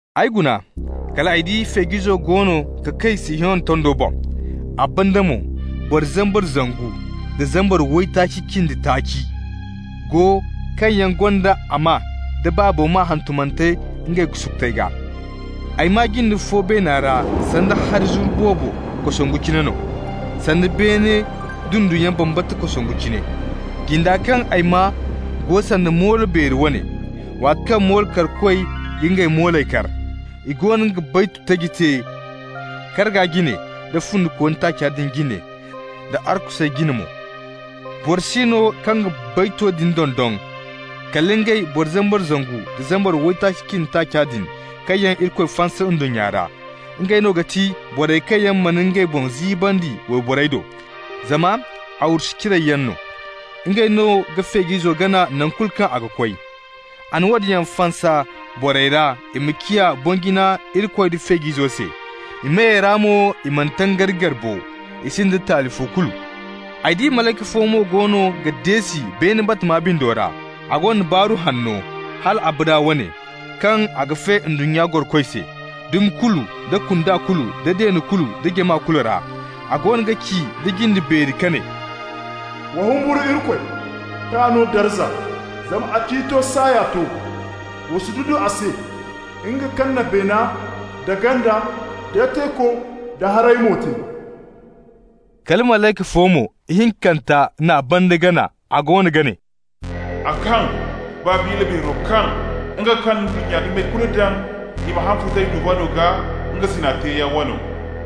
Ay guna kal ay di Feej'izo goono ga kay Sihiyona tondo boŋ, a banda mo boro zambar zangu nda zambar waytaaci cindi taaci go kaŋ yaŋ gonda a maa d'a Baabo maa hantumante ngey sukutey gaa. Ay maa jinde fo beena ra sanda hari zuru boobo kosongu cine no, sanda beene dunduyaŋ bambata kosongu cine. Jinda kaŋ ay maa go sanda moolo beeri wane, waati kaŋ mollo karkoy ga ngey mooley kar. I goono ga baytu taji te karga jine, da fundikooni taaca din jine da arkusey jine mo. Boro si no kaŋ ga bayto din dondon kala ngey boro zambar zangu nda zambar waytaaci cindi taaca din kaŋ yaŋ Irikoy fansa ndunnya ra. Ngey no ga ti borey kaŋ yaŋ mana ngey boŋ ziibandi wayborey do, zama arwasu ciray yaŋ no. Ngey no ga Feej'izo gana naŋ kulu kaŋ a ga koy. A na woodin yaŋ fansa borey ra i ma ciya boŋ-jina Irikoy da Feej'izo se. I meyey ra mo i mana tangari gar bo, i sinda taali fo kulu. Ay di malayka fo mo goono ga deesi beene batama bindo ra. A gonda Baaru Hanno, hal abada wane, kaŋ a ga fe ndunnya gorokoy se, dumi kulu, da kunda kulu, da deene kulu da jama kulu ra. A goono ga ci nda jinde beeri ka ne: «Wa humburu Irikoy, k'a no darza, zama a ciito saaya to. Wa sududu a se, nga kaŋ na beene, da ganda, da teeko da hari-moy te.» Kala malayka fo mo, ihinkanta n'a banda gana. A goono ga ne: «A kaŋ! Babila beero kaŋ! nga kaŋ na ndunnya dumey kulu daŋ i ma haŋ futay duvaŋo gaa, nga zina teeyaŋ wano.»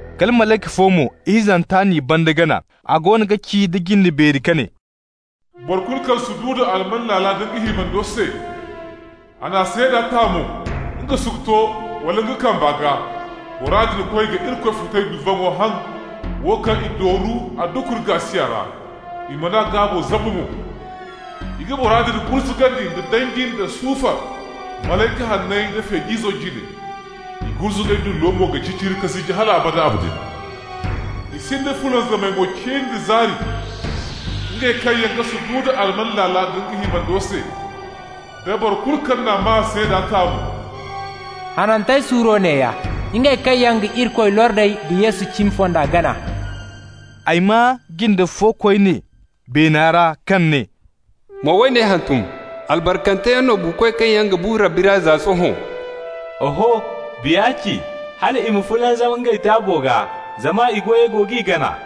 Kala malayka fo mo, ihinzanta n'i banda gana. A goono ga ci nda jinde beeri ka ne: «Boro kulu kaŋ sududu alman laala nda nga himando se, a n'a seeda ta mo nga sukuto wala a kamba gaa, bora din koy ga Irikoy futay duvaŋo haŋ, wo kaŋ i dooru a dukuri gaasiya ra, i man'a gaabo zabu mo. I ga bora din gurzugandi nda danji da sufar malayka hanney nda Feej'izo jine. I gurzugay dullo mo ga ciciri ka ziji hal abada abadin. I sinda fulanzamay mo cin da zaari, ngey kaŋ yaŋ ga sududu alman laala nda nga himando se, da boro kulu kaŋ n'a maa seeda ta mo. Hanantey suuro neeya: ngey kaŋ yaŋ ga Irikoy lordey da Yesu cimi fonda gana.» Ay maa jinde fo koyne beena ra kaŋ ne: «Ma woone hantum: Albarkanteyaŋ no buukoy kaŋ yaŋ ga bu Rabbi ra za sohõ. Oho, Biya ci, hal i ma fulanzam ngey taabo gaa, zama i goyey go g'i gana.»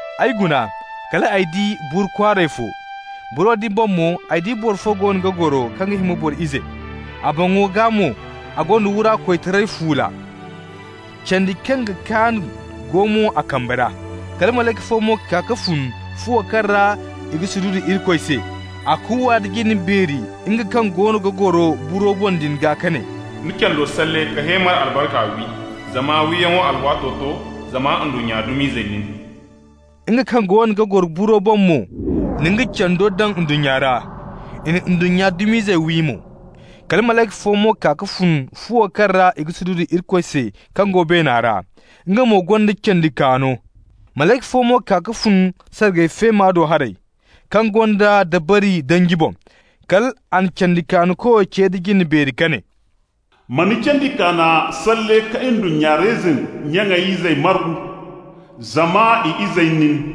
Ay guna kal ay di buru kwaaray fo. Buro din boŋ mo ay di boro fo goono ga goro kaŋ ga hima boro ize. A boŋo gaa mo a gonda wura koytaray fuula, candi kaŋ ga kaan go mo a kambe ra. Kala malayka fo mo kaa ka fun fuwo kaŋ ra i ga sududu Irikoy se. A kuuwa nda jinde beeri nga kaŋ goono ga goro buro boŋ din gaa ka ne: «Ni cando salle ka heemar albarka wi, zama wiyaŋo alwaato to, zama ndunnya dum'izey nin.» Nga kaŋ goono ga goro buro boŋ mo na nga cando daŋ ndunnya ra. I na ndunnya dum'izey wi mo. Kala malayka fo mo kaa ka fun fuwo kaŋ ra i ga sududu Irikoy se kaŋ go beena ra. Nga mo gonda candi kaano. Malayka fo mo kaa ka fun sargay feema do haray, kaŋ gonda dabari danji boŋ. Kal a na candi-kaano-koyo ce nda jinde beeri ka ne: «Ma ni candi kaana salle ka ndunnya reyzin nya izey margu, zama i izey nin.»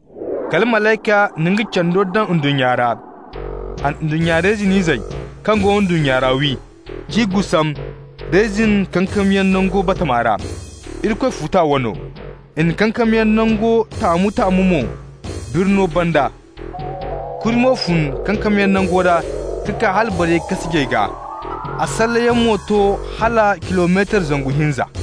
Kala malayka na nga cando daŋ ndunnya ra. A na ndunnya reyzin izey kaŋ go ndunnya ra wi, k'i gusam reyzin kankamyaŋ nangu bambata ra, Irikoy futa wano. I na kankamyaŋ nango taamu-taamu mo birno banda. Kuri mo fun kankamyaŋ nango ra ka kaa hala bariyey kaasijey gaa, a salleyaŋ mo to hala kilometar zangu hinza.